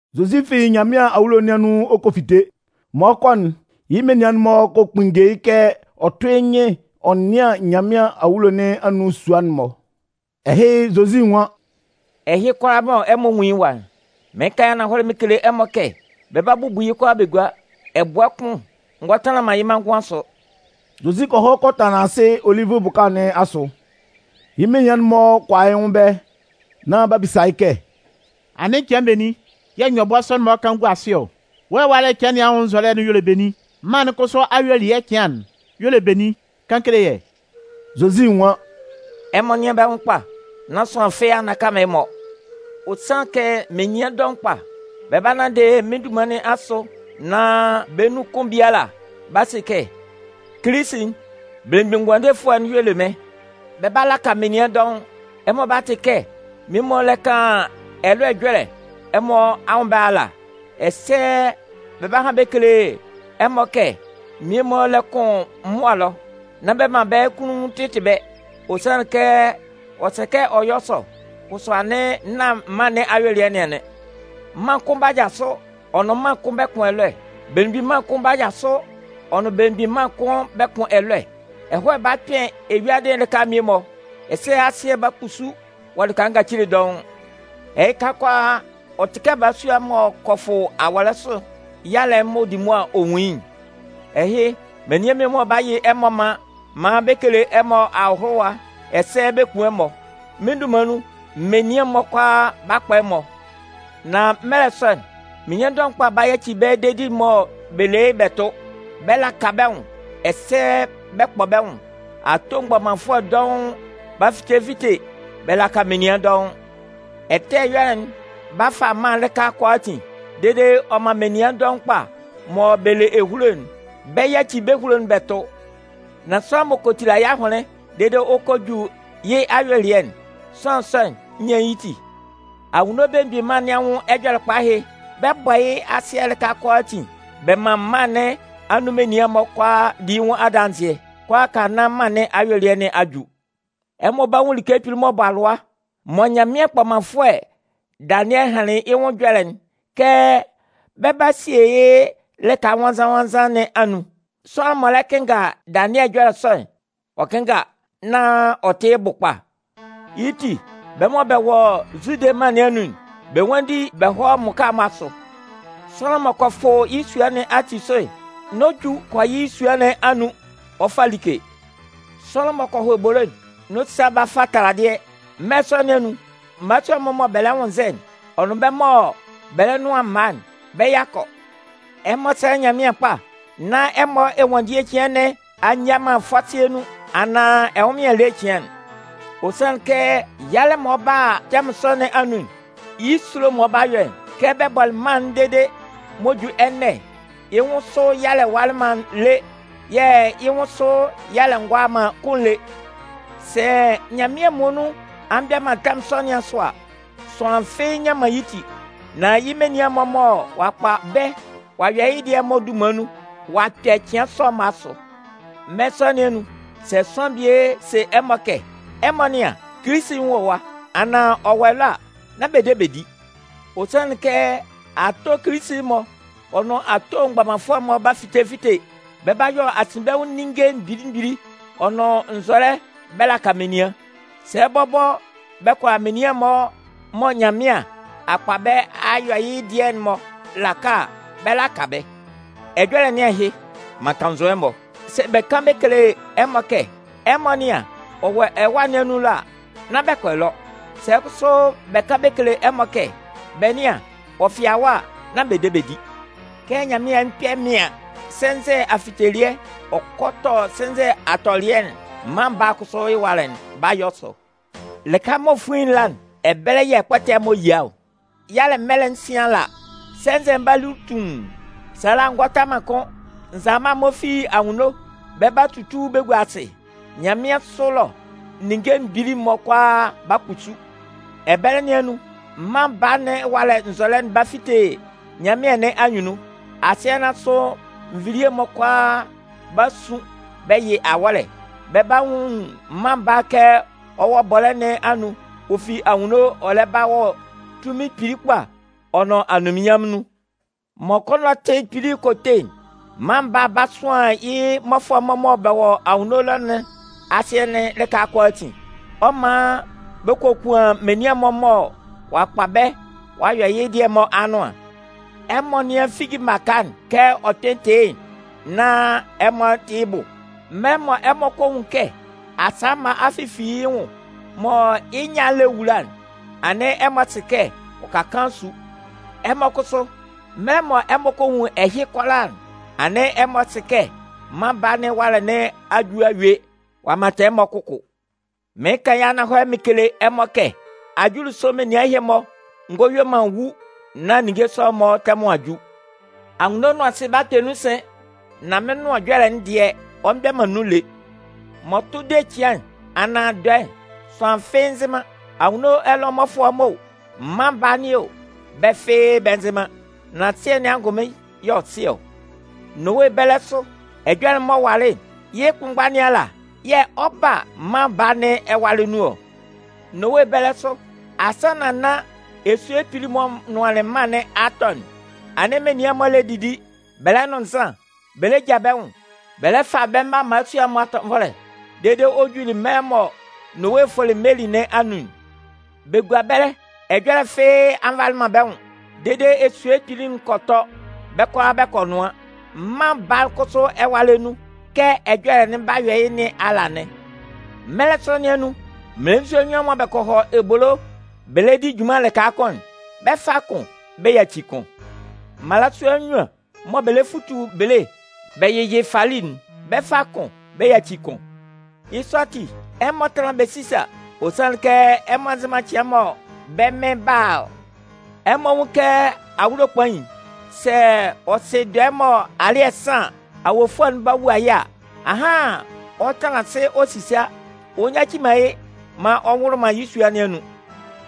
Zozi fi Nyanmɩan awulo nɩn anun ɔ kɔ fite. M'ɔ 'kɔ'n, yɩ́ menian'n-mɔ kɔ kpunnge yɩ́ kɛ ɔ tʋ́ yɩ́ nyɩn ɔ nɩ́an Nyanmɩan awulo nɩn anun sua'n-mɔ. Ɛhɩ, Zozi nwan: “Ɛhɩ kʋalaa mɔ ɛmɔ nwun yɩ́ ɛwa'n, mɩɩn kan yɩ́ ananhɔlɛ mɩn kele ɛmɔ kɛ bɛ 'ba bubu yɩ́ bɛ gua. Ɛbʋɛ baa kʋn ngɔ tanlan man yɩ́ manngʋn asʋ.” Zozi kɔ hɔ kɔ tanlan asɩ Olivʋ bʋka nɩn asʋ. Yɩ́ menian'n-mɔ kɔ a yɩ́ nwʋn ɛbɛlɛ, nán b'a bisa yɩ́ kɛ: “Anɩn cɩan benin yɛ̂ nyɔbʋɛ sɔ'n-mɔ 'kan gua asɩ ɔ? Wɔ́ ɛwalɛ cɩan nɩn anwʋn nzɔlɛ'n y'ɔ le benin? Mân'n kʋsʋ ayuelɩɛ cɩan'n y'ɔ le benin? Kan kele yɛ́.” Zozi nwan: “Ɛmɔ nɩ́an bɛ́ nwʋn kpa nán sʋanlan fɩ́ɩ́ a nnaka man ɛmɔ. Ɔ sanlɩn kɛ menian dɔʋn kpa, bɛ 'ba nanndɩ mɩ́n dunman nɩn asʋ nán bɛ́ nun kʋn biala 'ba se kɛ: ‘Kilisi'n, Belemgbin Ngʋandefʋɛ'n, y'ɔ le mɩ́n.’ Bɛ 'laka menian dɔʋn. Ɛmɔ 'ba tɩ kɛ menian'n-mɔ lɛ kan ɛlɔɛ ɛjɔlɛ ɛmɔ anwʋn ɛbɛlɛ ala, ɛsɛ bɛ 'ba han bɛ kele ɛmɔ kɛ mmie-mɔ lɛ kʋn mʋa ɛlɔ. Nán bɛ man bɛ́ kunnun tɩtɩ bɛ́, ɔ sanlɩn kɛ ɔ sɛ kɛ ɔ yɔ́ sɔ, kʋsʋ anɩn nán mân nɩn ayuelɩɛ nɩn anɩn. Mân kʋn 'ba jasʋ ɔ nʋn mân kʋn bɛ kʋn ɛlɔɛ. Belemgbin mân kʋn 'ba jasʋ ɔ nʋn belemgbin mân kʋn bɛ kʋn ɛlɔɛ. Ɛhɔɛ 'ba kpɩn eyuadɩ'n lɩka mmie-mɔ, ɛsɛ asɩɛ'n 'ba kpusu wɔ lɩka ngacile dɔʋn. Ɛhɩka kʋalaa, ɔ tɩ kɛ balasua m'ɔ kɔ fʋ awɔlɛ sʋ yalɛ'n m'ɔ di mʋa ɔ nwun yɩ́'n. “Ɛhɩ, menian'n-mɔ 'ba yɩ ɛmɔ man maan bɛ kele ɛmɔ ahʋlʋwa ɛsɛ bɛ 'kun ɛmɔ. Mɩ́n dunman nun, menian'n-mɔ kʋalaa 'ba kpɔ ɛmɔ. Nan mɛlɛ sɔ'n, menian dɔʋn kpa 'ba yaci bɛ́ dedi'n mɔ bɛ le yɩ́'n bɛ tʋ. Bɛ 'laka bɛ́ nwʋn ɛsɛ bɛ 'kpɔ bɛ́ nwʋn. Ato mgbɔmanfʋɛ dɔʋn 'ba fite fite bɛ laka menian dɔʋn. Ɛtɛ ɛyɔlɛ'n 'ba fa mân'n lɩka kʋalaatin dede ɔ man menian dɔʋn kpa mɔ bɛ le ehulo'n, bɛ 'yaci bɛ́ ehulo'n bɛ tʋ. Nan sʋanlan m'ɔ kɔ tila yɩ́ ahʋnlɩn dede ɔ kɔ ju yɩ́ ayuelɩɛ'n, sʋanlan sɔ'n 'nyan yɩ́ ti. Anwunno Belemgbin Mân nɩn anwʋn Ɛjɔlɛkpa ɛhɩ, bɛ 'bɔ yɩ́ asɩɛ'n lɩka kʋalaatin bɛ man mân nɩn anun menian'n-mɔ kʋalaa di yɩ́ nwʋn adanzɩɛ, kʋalaaka nán mân nɩn ayuelɩɛ cɩan nɩn a ju. “Ɛmɔ 'ba nwun like ɛtɛ kpili'n m'ɔ bɔ alʋa mɔ Nyanmɩan kpɔmanfʋɛ Danɩɛ hanlɩn yɩ́ nwʋn ɛjɔlɛ'n kɛ bɛ 'ba sie yɩ́ lɩka nwannzan-nwannzan nɩn anun. (Sʋanlan m'ɔ lɛ kɩnnga Danɩɛ ɛjɔlɛ sɔ'n, ɔ kɩ́nnga nán ɔ tɩ yɩ́ bʋ kpa.) Yɩ́ ti, bɛ́ mɔ bɛ wɔ Zude mân nɩn anun'n, bɛ nwánndi bɛ hɔ́ mmʋka'n-mɔ asʋ. Sʋanlan m'ɔ kɔ fʋ yɩ́ sua nɩn ati sʋ'n, n'ɔ ju kɔ yɩ́ sua nɩn anun, ɔ fa like. Sʋanlan m'ɔ kɔ hɔ ebolo'n, n'ɔ sa ba fa taladɩɛ. Mɛlɛ sɔ nɩn anun, mmalasua'n-mɔ mɔ bɛ lɛ nwʋnnzɛ'n, ɔ nʋn bɛ́ mɔ bɛ lɛ nʋan mma'n, bɛ́ yakɔ! Ɛmɔ sɛ́lɛ Nyanmɩan kpa nán ɛmɔ ɛnwanndie cɩan nɩn a nyia man fɔsɩɛ nun, anaan ɛnwʋnmɩan ele cɩan. Ɔ sanlɩn kɛ yalɛ'n mɔ ɔ 'ba a tɛmʋn sɔ nɩn anun'n, yɩ́ esulo mɔ ɔ 'ba yɔ'n, kɛ bɛ bɔlɩ mân'n dede m'ɔ ju ɛnɛ'n, yɩ́ nwʋn sʋ yalɛ walɩ man lé, yɛ̂ yɩ́ nwʋn sʋ yalɛ ngɔ a man kʋ́n lé. Sɛ Nyanmɩan muonun a mgbɛ man tɛmʋn sɔ nɩn asʋ a, sʋanlan fɩ́ɩ́ nnyan man yɩ́ ti. Nan yɩ́ menian'n-mɔ mɔ ɔ'a kpa bɛ́ ɔ'a yɔ yɩ́ dɩɛ'n-mɔ dunman nun, ɔ'a kpɛ cɩan sɔ'n-mɔ asʋ. Mɛlɛ sɔ nɩn anun, sɛ sʋanlan bie se ɛmɔ kɛ: ‘Ɛmɔ nɩ́an, Kilisi'n wɔ ɛwa!’ anaan ‘Ɔ wɔ ɛlɔ!’ a, nán bɛ de bɛ di. Ɔ sanlɩn kɛ ato Kilisi-mɔ ɔ nʋn ato mgbɔmanfʋɛ-mɔ 'ba fite fite, bɛ 'ba yɔ asinbɛnwʋn ninnge mgbili mgbili ɔ nʋn nzɔlɛ bɛ laka menian. Sɛ bɔbɔ bɛ kʋala menian'n-mɔ mɔ Nyanmɩan a kpa bɛ́ a yɔ yɩ́ dɩɛ'n-mɔ laka a, bɛ 'laka bɛ́. Ɛjɔlɛ nɩn ahɩ! M'an kannzʋ ɛmɔ! Sɛ bɛ kan bɛ kele ɛmɔ kɛ: ‘Ɛmɔ nɩ́an, ɔ wɔ ɛwâ nɩn anun ɛlɔ’ a, nán bɛ kɔ ɛlɔ. Sɛ kʋsʋ bɛ kan bɛ kele ɛmɔ kɛ: ‘Bɛ nɩ́an, ɔ fɩa ɛwa’ a, nán bɛ de bɛ di. Kɛ nyanmɩan'n kpɛ mɩaɩn sɛnzɛ afitelɩɛ ɔ kɔ tɔ sɛnzɛ atɔlɩɛ'n, Mân Baa'n kʋsʋ ɛwalɛ'n 'ba yɔ sɔ. Lɩka mɔ fuin'n la'n, ɛbɛlɛ yɛ̂ ɛkpɔtɛ'n-mɔ yia ɔ. “Yalɛ mɛlɛ'n sɩn ala, sɛnzɛ'n 'ba lu tuun. Sala'n ngɔ ta man kʋ́n. Nzalama'n-mɔ fi anwunno bɛ 'ba tutu bɛ gua asɩ. Nyanmɩansʋ ɛlɔ ninnge mgbili'n-mɔ kʋalaa 'ba kpusu. Ɛbɛlɛ nɩn anun, Mân Baa nɩn ɛwalɛ nzɔlɛ'n 'ba fite nyanmɩan nɩn anyunnun. Asɩɛ nɩn asʋ nvilie'n-mɔ kʋalaa 'ba sun bɛ yɩ awɔ́lɛ, bɛ 'ba nwun Mân Baa'n kɛ ɔ wɔ bɔlɛ́ nɩn anun ɔ fi anwunno ɔ lɛ ba wɔ tunmin kpili kpa ɔ nʋn anunminnyanmʋn nun. Mɔ kɔnɔtɩ kpili'n kɔ te'n, Mân Baa'n 'ba sʋan yɩ́ mmɔfʋɛ'n-mɔ mɔ bɛ wɔ anwunno ɛlɔ nɩn asɩɛ'n lɩka kʋalaatin. Ɔ 'man bɛ kokuan menian'n-mɔ mɔ ɔ'a kpa bɛ́ ɔ'a yɔ yɩ́ dɩɛ'n-mɔ anʋan. “Ɛmɔ nɩ́an figi baka'n kɛ ɔ kpɩn tɩ yɩ́'n nán ɛmɔ tɩ́ yɩ́ bʋ. Mɛlɛ mɔ ɛmɔ kɔ nwun kɛ asa mma a fifi yɩ́ nwʋn mɔ yɩ́ nyâ'n lɛ wula'n, anɩn ɛmɔ sɩ kɛ ɔ ka kaan su. Ɛmɔ kʋsʋ, mɛlɛ mɔ ɛmɔ kɔ nwun ɛhɩ kʋalaa'n, anɩn ɛmɔ sɩ kɛ Mân Baa nɩn ɛwalɛ nɩn a ju a yue ɔ'a mantan ɛmɔ kʋkʋ. Mɩɩn kan yɩ́ ananhɔlɛ mɩn kele ɛmɔ kɛ ajulisʋ menian ɛhɩ-mɔ ngɔ yue man wu nán ninnge sɔ'n-mɔ tɛmʋn a ju. Anwunno nʋn asɩ 'ba kpɛ nun sɩn, nan mɩ́n Nʋan Ɛjɔlɛ'n dɩɛ, ɔ mgbɛ man nun lé. “M'ɔ tʋ de cɩan'n, anaan dɔɛ'n, sʋanlan fɩ́ɩ́ nzɩ man. Anwunno ɛlɔ mmɔfʋɛ'n-mɔ o, Mân Baa nɩn o, bɛ́ fɩ́ɩ́ bɛ nzɩ man. Nan Sɩɛ nɩn angʋnmɩn y'ɔ sɩ ɔ. Nowe bɛlɛ sʋ, ɛjɔlɛ'n m'ɔ walɩ'n, yɩ́ kʋnmgba nɩn ala yɛ̂ ɔ 'ba a Mân Baa nɩn ɛwalɛ nun ɔ. Nowe bɛlɛ sʋ, asannan nán esue kpili'n m'ɔ nʋanlɩn mân nɩn a tɔ'n, anɩn menian'n-mɔ lɛ didi, bɛ lɛ nʋn nzan, bɛ lɛ ja bɛ́ nwʋn, bɛ lɛ fa bɛ́ mma mmalasua'n-mɔ atɔnvɔlɛ, dede ɔ juli mɛlɛ mɔ Nowe fʋlɩ meli nɩn anun'n. Bɛ gua ɛbɛlɛ, ɛjɔlɛ fɩ́ɩ́ a nvalɩ bɛ́ nwʋn, dede esue kpili'n kɔ tɔ, bɛ́ kʋalaa bɛ kɔ nʋan. Mân Baa'n kʋsʋ ɛwalɛ nun, kɛ ɛjɔlɛ'n 'ba yɔ yɩ́ nɩn ala anɩn. Mɛlɛ sɔ nɩn anun, mmelenzua nnyuan mɔ bɛ kɔ hɔ ebolo bɛ lɛ di junman lɩka kʋn'n, bɛ 'fa kʋn bɛ yaci kʋn. Mmalasua nnyuan mɔ bɛ lɛ futu bele bɛ yɩ yɩ́ fali'n, bɛ 'fa kʋn bɛ yaci kʋn. “Yɩ́ sɔ ati, ɛmɔ tánlan bɛ sísa, ɔ sanlɩn kɛ, ɛmɔ nzɩ man cɩan'n mɔ bɛ́ Mɩn 'ba ɔ. Ɛmɔ nwún yɩ́ kɛ awulo kpain'n, sɛ ɔ sɩ dɔɛ'n mɔ alɩ́ɛ san an, awofʋɛ'n ba ɔ wua yɩ́ a, ahan ɔ 'tanlan asɩ ɔ sisa, ɔ nyaci man yɩ́ maan ɔ nwʋlʋ man yɩ́ sua nɩn anun.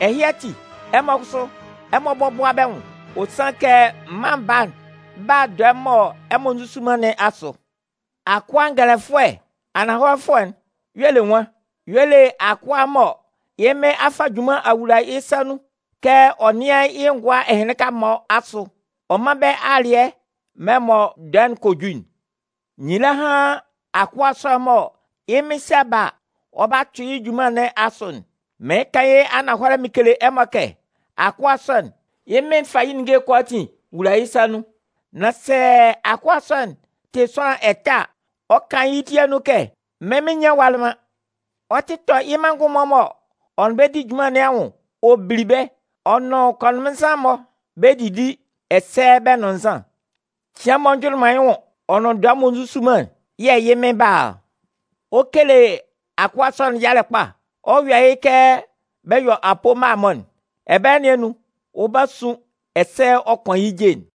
Ɛhɩ ati, ɛmɔ kʋsʋ, ɛmɔ bɔ́bʋa bɛ́ nwʋn, ɔ sanlɩn kɛ, Mân Baa'n 'ba a dɔɛ mɔ ɛmɔ nzusu man nɩn asʋ. “Akʋa ngɛlɛfʋɛ ananhɔlɛfʋɛ'n, y'ɔ le nwan? Y'ɔ le akʋa'n mɔ yɩ́ mɩn a fa junman a wula yɩ́ sa nun kɛ ɔ nɩ́an yɩ́ ngʋa ɛhɩnlɩnka-mɔ asʋ, ɔ mán bɛ́ alɩɛ mɛlɛ mɔ dɔɛ'n kɔ ju'n. Nyila hán akʋa sɔ'n mɔ yɩ́ mɩn 'sa ba a, ɔ 'ba tʋ yɩ́ junman nɩn asʋ'n! Mɩɩn kan yɩ́ ananhɔlɛ mɩn kele ɛmɔ kɛ, akʋa sɔ'n, yɩ́ mɩn'n 'fa yɩ́ ninnge'n kʋalaatin wula yɩ́ sa nun. Nan sɛ akʋa sɔ'n tɩ sʋanlan ɛtɛ a, ɔ 'kan yɩ́ ti anun kɛ: ‘Mɩ́n mɩn nnyan walɩ man.’ Ɔ 'tɩ tɔ yɩ́ manngʋn'n-mɔ mɔ ɔ nʋn bɛ di junman nɩn anwʋn ɔ bili bɛ́, ɔ nʋn kɔnʋnmɩnnzan'n-mɔ bɛ 'didi ɛsɛ bɛ 'nʋn nzan. Cɩan m'ɔ njʋnlɩn man yɩ́ nwʋn ɔ nʋn dɔɛ m'ɔ nzusu man'n, yɛ̂ yɩ́ mɩn'n 'ba a ɔ. Ɔ 'kele akʋa sɔ'n yalɛ kpa, ɔ 'yɔ yɩ kɛ bɛ yɔ apoo mma-mɔ'n. Ɛbɛlɛ nɩn anun, ɔ 'ba sun ɛsɛ ɔ 'kʋan yɩ́ je'n.